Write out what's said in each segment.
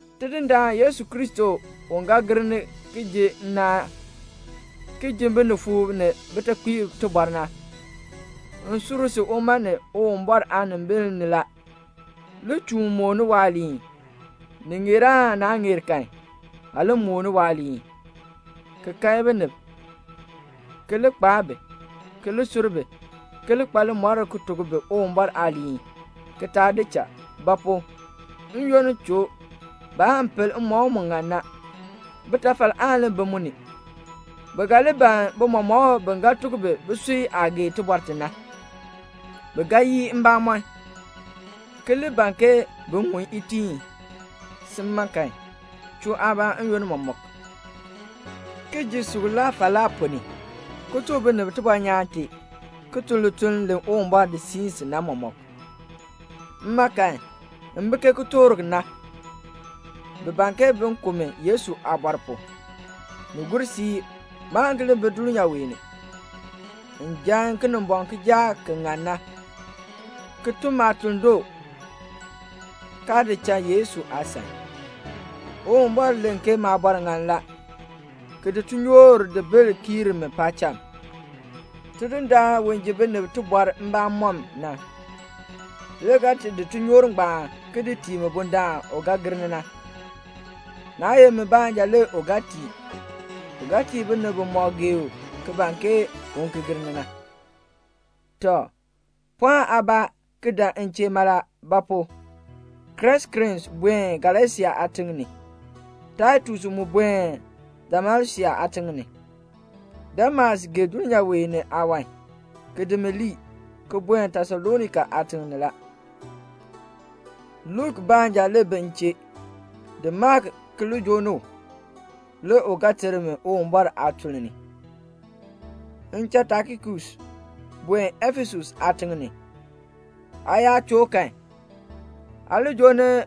Tidindaan Yesu Kristo u ga gir ni ki ji nnaan, ki ji binifuub ni bitekpiib tibɔr na, m sur si uma ni Uwumbɔr aanimbil ni la, li chuun mooni waaliin. Ni ŋeer aan naa ŋeer kan, aa li mooni waaliin, ki kae binib, ki li kpaa bi, ki li sur bi, ki li kpa limɔr ki tuk bi Uwumbɔr aaliin, ki taa di cha. Ba pu? n-yoonn choo, baan pel mmɔkm mu ŋan na. Bitafal aan li bi mu ni. Bi ga li ban bimɔmɔkb bi ga tuk bi bisui aah gee tibɔr ti na. Bi ga yii mbamɔn, ki li ban ke bin ŋun itiin. Sin, chuu aabaa n-yoonn mɔmɔk, ki ji suklaa falaa ponn ni, ki tuk binib tibɔnyaan tee, ki tun lituln li Uwumbɔr di siin si na mɔmɔk. Mma kan, m bi ke kitork na; bi ban bin ku mi Yesu aabɔr pu. Ni gur siib, maan ki li bi dulnyaa wee ni. M jaa Kinimbɔŋ kijaak ki ŋan na, ki tun maatuln doo, kaa di cha Yesu aasan. Uwumbɔr len ke maabɔr ŋan la, ki di tinyoor di bil kiir mi paacham. Tidindaan u ji binib tibɔr mbamɔm na, le ga ti di tinyoor ngbaan ki di tii mi bundaln u ga gir ni na. Naa ye mi baanja le u ga tii. U ga tii binib bimɔk gee u ki ban ke u ki gir ni na. Tɔ, pɔɔn aabaa ki dan m chee mala; ba pu? Kreskens buen Galasia aatiŋ ni, Taitus mu buen Dalmasia aatiŋ ni. Demas gee dulnyaa wee ni aawan, ki di mi lii, ki buen Tesalonika aatiŋ ni la. Luk baanja le bi m chee. Di Mak ki li joo ni u, le u ga ter mi Uwumbɔr aatuln ni. M cha Tikikus buen Efesus aatiŋ ni la. Aa yaa choo kan, aa li joo ni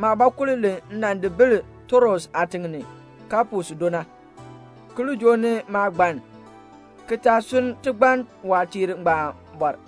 maabɔkul li m nan di bil Troas aatiŋ ni, Kapus do na, ki li joo ni maagbann, ki taa sunn tigbann waatiir ngbaan bɔr.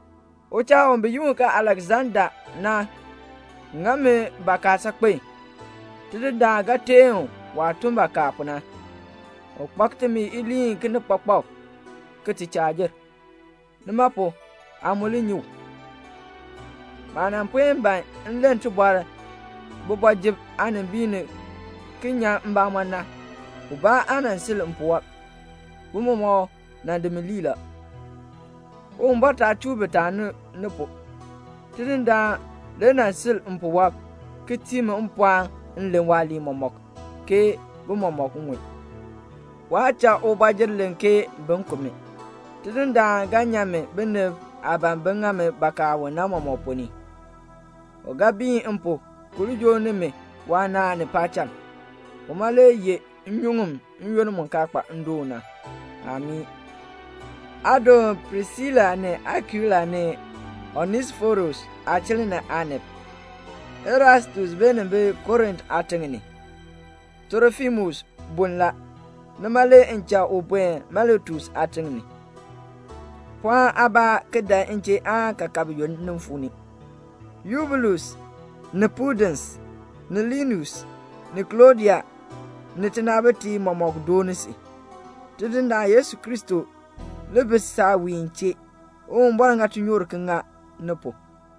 Uchaa bi yi u Aleksanda nan ŋa mi bakaa saakpen. Tidindaan ga teen u waah tun bakaa pu na. U kpak timi aaliin kinikpakpak ki ti chaa jer, nima pu na aa mu li nyi u. Maah nan puen ban m len tibɔr kooti ni ki nyan maabamɔn na, ubaa aa sil mpuwɔb, bi mɔmɔk di mi lii la. Uwumbɔr taa chuu bi taani ni pu. Tidindaan le nan sil mpuwɔb, ki tii mi mpɔɔn m len waaliin mɔmɔk, ke bi mɔmɔk ŋun. Waa cha ubɔjir len ke bin ku mi. Tidindaan ga nyan mi binib aah ban bin ŋa mi bakaa u na mɔmɔk ponn ni. U ga biin m pu ki li joo ni mi waanaan ni paacham. Uma le yeh nnyuŋ n-yoonn mu kaa kpa ndoon na. Amii. Aa doon Prisila ni Akuila ni Onesiforus aachiln ni aanib. Erastus beenin bi Korint aatiŋ ni la. Trofimus bun la, nima le m cha u bee Miletus aatiŋ ni. Pɔɔn aabaa ki dan m chee aan kaakab yoonn nin fuu ni. Yubulus, ni Pudens, ni Linus, ni Klɔdia ni tinaabitiib mɔmɔk dooni si. Tidindaan Yesu Kristo li bi saawiin chee. Uwumbɔr ŋa tinyoor ki ŋa ni pu.